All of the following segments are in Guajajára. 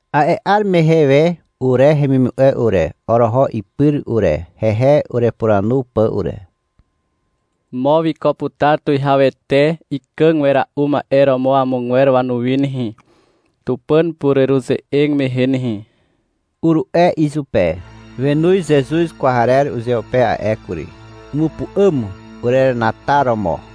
A'e 'ar mehe we ure hemimu'e ure, oroho ipyr ure, hehe urepuranu pà ure. — Mo wiko putar tuwihawete ikàg wera'u ma'e romo amogwer wanuwi nehe, Tupàn pureruze'eg mehe nehe, uru'e izupe. Wenoz Zezuz kwarer uzeupe a'e kury. Umupu'àm urerenataromo.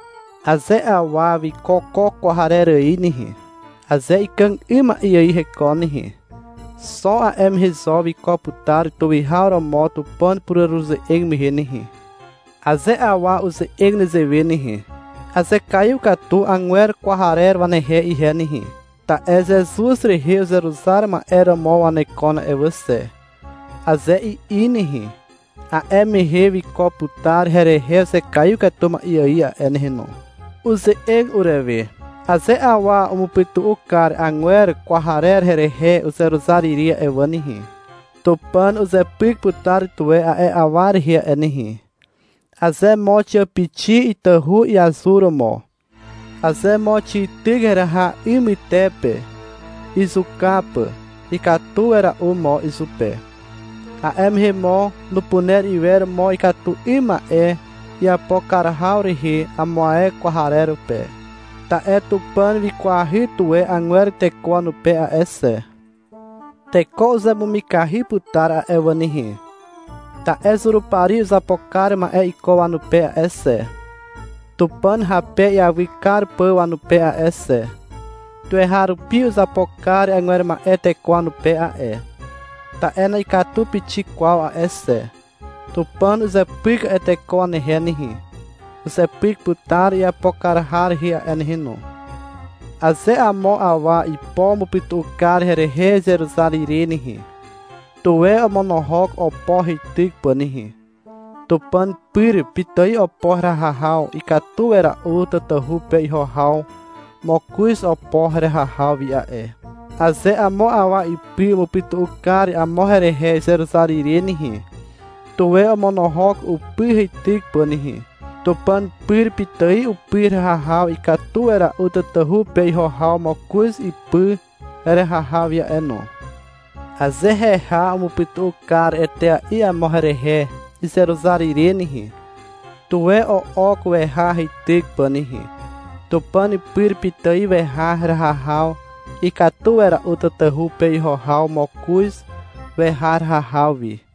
Aze awa wiko ko kwarer ài nehe, aze ikàg 'ym ma'e ài hekon nehe, xo a'e mehe zo wiko putar tuwihaw romo Tupàn pureruze'eg mehe nehe. Aze awa uze'eg nezewe nehe, — Azekaiw katu putar agwer kwarer wanehe ihe nehe, ta'e Zezuz rehe uzeruzar ma'e romo wanekon a'e wà xe, aze i'i nehe, a'e mehe wiko putar herehe uzekaiw katu ma'e ài a'e nehe no. Uze'eg urewe. — Aze awa umupytu'u kar agwer kwarer herehe uzeruzar ire a'e wà nehe, Tupàn uzepyk putar tuwe a'e awa rehe a'e nehe. Aze mo xiàpixi itahu iazuromo, aze mo xityk heraha 'y mytepe, izuka pà, ikatu wera'u mo izupe. A'e mehe mo nupuner iwer mo ikatu 'ym ma'e iapo kar haw rehe amo ae kwarer pe. Ta'e Tupàn wikwahy tuwe agwer teko wanupe a'e xe. Teko uzemumikahy putar a'e wà nehe, ta'e Zurupari uzapo kar ma'e iko wanupe a'e xe, Tupàn hape iawy kar pà wanupe a'e xe. Tuweharupi uzapo kar agwer ma'e teko wanupe a'e, ta'e na'ikatu pixik kwaw a'e xe. Tupàn uzepyk putar a'e teko wanehe nehe. Uzepyk putar iapo kar har rehe a'e nehe no. Aze amo awa ipo umupytu'u kar herehe izeruzar ire nehe, tuwe omonohok opo heityk pà nehe. Tupàn pyr pitài opo heraha haw ikatu wera'u tatahu pe iho haw mokoz opo heraha haw wi a'e. Aze amo awa ipy umupytu'u kar amo herehe izeruzar ire nehe, tuwe omonohok upy heityk pà nehe. Tupàn pyr pitài upy heraha haw ikatu wera'u tatahu pe iho haw mokoz upy heraha haw wi a'e no. Aze heha umupytu'u kar etea'i amo herehe izeruzar ire nehe, tuwe o'ok weha heityk pà nehe. Tupàn pyr pitài weha heraha haw ikatu wera'u tatahu pe iho haw mokoz weha heraha haw wi.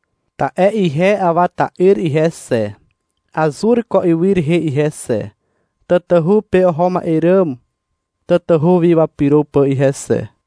Ta'e ihe Awa ta'yr ihe xe, azur ko ywy rehe ihe xe, tatahu pe oho ma'e ràm tatahu wi wapyro pà ihe xe.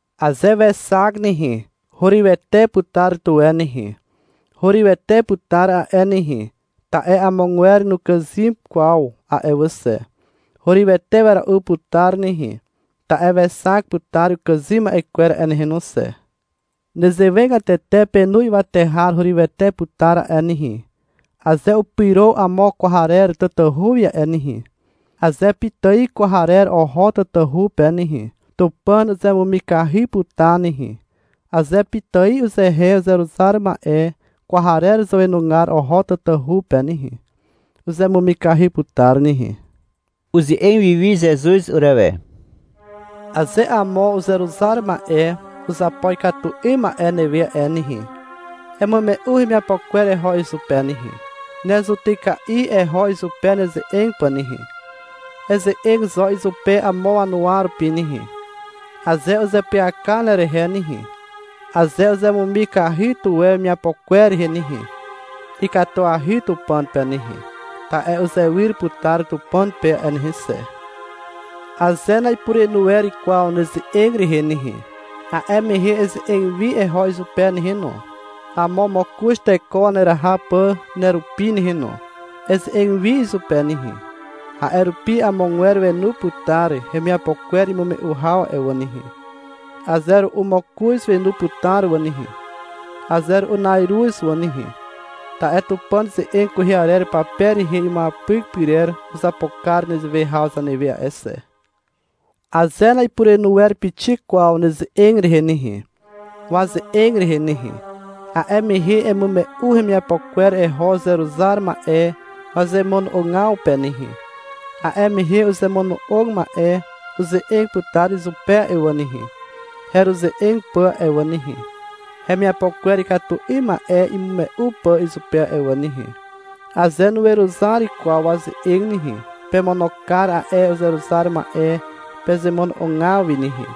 Aze wexak nehe, hurywete putar tuwe nehe. Hurywete putar a'e nehe, ta'e amogwer nukàzym kwaw a'e wà xe. Hurywete wera'u putar nehe, ta'e wexak putar ukàzym ma'e kwer a'e nehe no xe. Nezewegatete penu ywate har hurywete putar a'e nehe, aze upyro amo kwarer tatahu wi a'e nehe. Aze pitài kwarer oho tatahu pe nehe, Tupàn uzemumikahy putar nehe. (Aze pitài uzehe uzeruzar ma'e kwarer zàwenugar oho tatahu pe nehe, uzemumikahy putar nehe.) (Uze'eg wiwi Zezuz urewe.) — Aze amo uzeruzar ma'e uzapo ikatu 'ym ma'e newe a'e nehe, emume'u hemiapo kwer eho izupe nehe. Ne zutyka'i eho izupe neze'eg pà nehe. Eze'eg zo izupe amo wanuwa rupi nehe. Aze uzeapyaka nerehe nehe, aze uzemumikahy tuwe wemiapo kwer rehe nehe, ikatuahy Tupàn pe nehe, ta'e uzewyr putar Tupàn pe a'e nehe xe. Aze na'ipurenu wer kwaw neze'eg rehe nehe, a'e mehe eze'eg wi eho izupe nehe no, amo mokoz teko waneraha pà nerupi nehe no. Eze'eg wi izupe nehe. A'e rupi amogwer wenu putar hemiapo kwer imume'u haw a'e wà nehe. Aze ru'u mokoz wenu putar wà nehe, aze ru'u na'iruz wà nehe. Ta'e Tupàn ze'eg kwehe arer pape rehe imuapyk pyrer uzapo kar nezewe haw zanewe a'e xe. Aze na'ipurenu wer pixik kwaw neze'eg rehe nehe, waze'eg rehe nehe, a'e mehe emume'u hemiapo kwer eho uzeruzar ma'e wazemono'ogaw pe nehe. A'e mehe uzemono'og ma'e uze'eg putar izupe a'e wà nehe, heruze'eg pà a'e wà nehe, hemiapo kwer ikatu 'ym ma'e imume'u pà izupe a'e wà nehe. Aze nuweruzar kwaw waze'eg nehe, pemono kar a'e uzeruzar ma'e pezemono'ogaw wi nehe,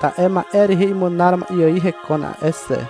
ta'e ma'e rehe imunar ma'e ài hekon a'e xe.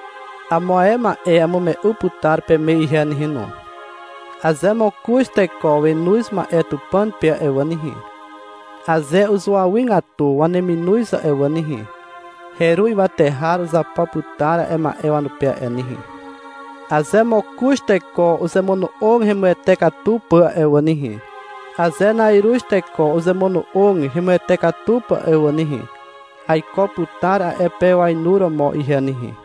Amo ae ma'e amume'u putar peme ihe nehe no. — Aze mokoz teko wenoz ma'e Tupàn pe a'e wà nehe, aze uzuawygatu waneminoz a'e wà nehe, heru ywate har uzapo putar a'e ma'e wanupe a'e nehe. Aze mokoz teko uzemono'og hemuwete katu pà a'e wà nehe, aze na'iruz teko uzemono'og hemuwete katu pà a'e wà nehe, aiko putar a'e pe wainuromo ihe nehe.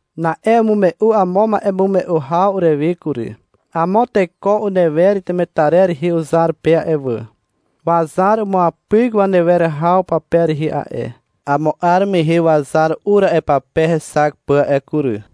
Na'e umume'u amo ma'emume'u haw urewe kury. — Amo teko unewer temetarer rehe uzar pe a'e wà. Wazar umuapyk wanewer haw pape rehe a'e. Amo 'ar mehe wazar ur a'e pape hexak pà a'e kury.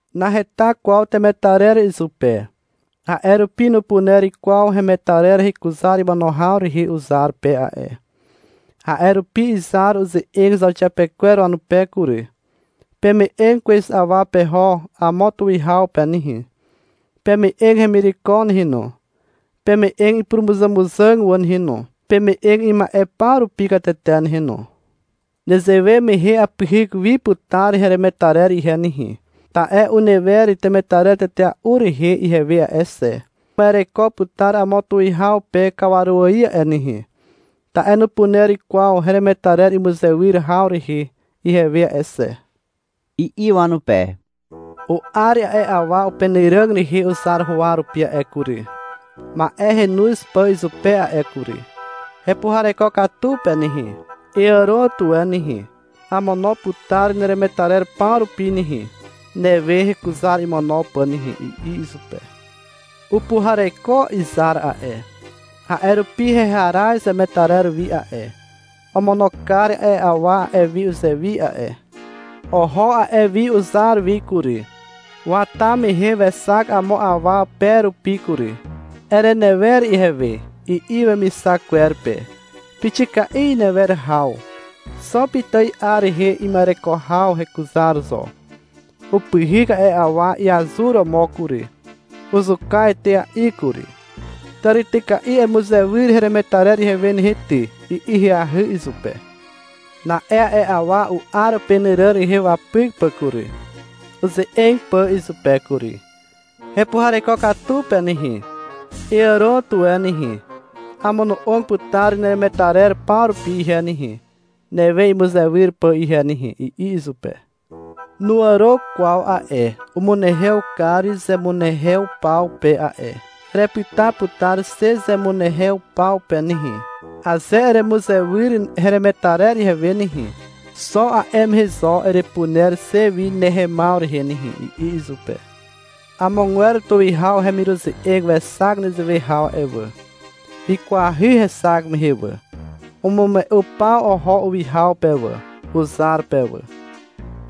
Naheta kwaw temetarer izupe, a'e rupi nupuner kwaw hemetarer hekuzar imono haw rehe uzar pe a'e. A'e rupi izar uze'eg zauxiapekwer wanupe kury. — Peme'eg kwez awa peho amo tuwihaw pe nehe. Peme'eg hemireko nehe no, peme'eg ipurumuzàmuzàg wà nehe no, peme'eg ima'e paw rupi katete nehe no. Nezewe mehe apyhyk wi putar heremetarer ihe nehe. Ta'e unewer temetarer tetea'u rehe ihewe a'e xe. Uma'ereko putar amo tuwihaw pe kawaru ài a'e nehe, ta'e nupuner kwaw heremetarer imuzewyr haw rehe ihewe a'e xe, i'i wanupe. U'ar a'e awa upenàràg rehe uzar huwa rupi a'e kury, ma'e henoz pà izupe a'e kury. — Hepuhareko katu pe nehe, eàro tuwe nehe, amono'og putar neremetarer paw rupi nehe, newe hekuzar imono pà nehe, i'i izupe. Upuhareko izar a'e. A'e rupi heharaz wemetarer wi a'e. Omono kar a'e awa a'e wi uzewi a'e. Oho a'e wi uzar wi kury. Wata mehe wexak amo awa pe rupi kury. — Erenewer ihewe, i'i wemixak kwer pe. Pixika'i inewer haw. (Xo pitài 'ar rehe ima'ereko haw hekuzar zo). Upyhyk a'e awa iazuromo kury, uzuka etea'i kury. — Tàrityka'i emuzewyr heremetarer ihewe nehe ty, i'i ahyahy izupe. Na'e a'e awa u'ar upenàràg rehe wapyk pà kury, uze'eg pà izupe kury. — Hepuhareko katu pe nehe, eàro tuwe nehe. Amono'og putar neremetarer paw rupi ihe nehe, newe imuzewyr pà ihe nehe, i'i izupe. Nuàro kwaw a'e. Umunehew kar zemunehew paw pe a'e. — Erepyta putar xe zemunehew paw pe nehe. Aze eremuzewyr heremetarer ihewe nehe, xo a'e mehe zo erepuner xe wi nehemaw rehe nehe, i'i izupe. Amogwer tuwihaw hemiruze'eg wexak nezewe haw a'e wà. Wikwahy hexak mehe wà. Umume'u paw oho uwihaw pe wà, uzar pe wà.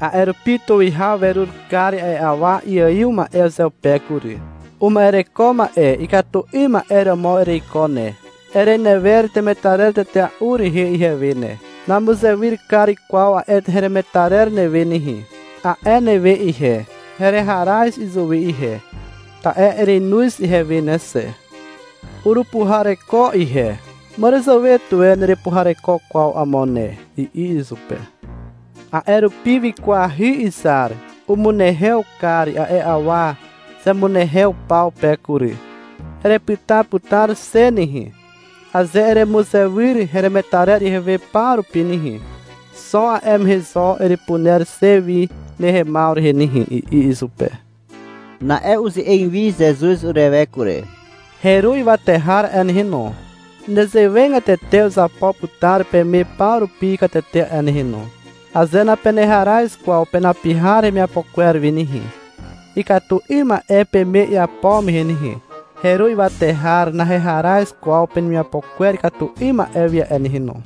A'e rupi tuwihaw werur kar a'e awa iaiw ma'e uzeupe kury. — Uma'ereko ma'e ikatu 'ym ma'e romo ereiko ne. Erenewer temetarer tetea'u rehe ihewe ne. — Namuzewyr kar kwaw a'e heremetarer newe nehe, a'e newe ihe. Hereharaz izuwi ihe, ta'e erenoz ihewe ne xe. Urupuhareko ihe. Màràzàwe tuwe nerepuhareko kwaw amo ne, i'i izupe. A'e rupi wikwahy izar. Umunehew kar a'e awa zemunehew paw pe kury. — Erepyta putar xe nehe. Aze eremuzewyr heremetarer ihewe paw rupi nehe, xo a'e mehe zo erepuner xe wi nehemaw rehe nehe, i'i izupe. Na'e uze'eg wi Zezuz urewe kury. — Heru ywate har a'e nehe no, nezewegatete uzapo putar peme paw rupi katete a'e nehe no. Aze napeneharaz kwaw penapihar hemiapo kwer wi nehe, ikatu 'ym ma'e peme iapo mehe nehe, heru ywate har naheharaz kwaw penemiapo kwer ikatu 'ym ma'e wi a'e nehe no.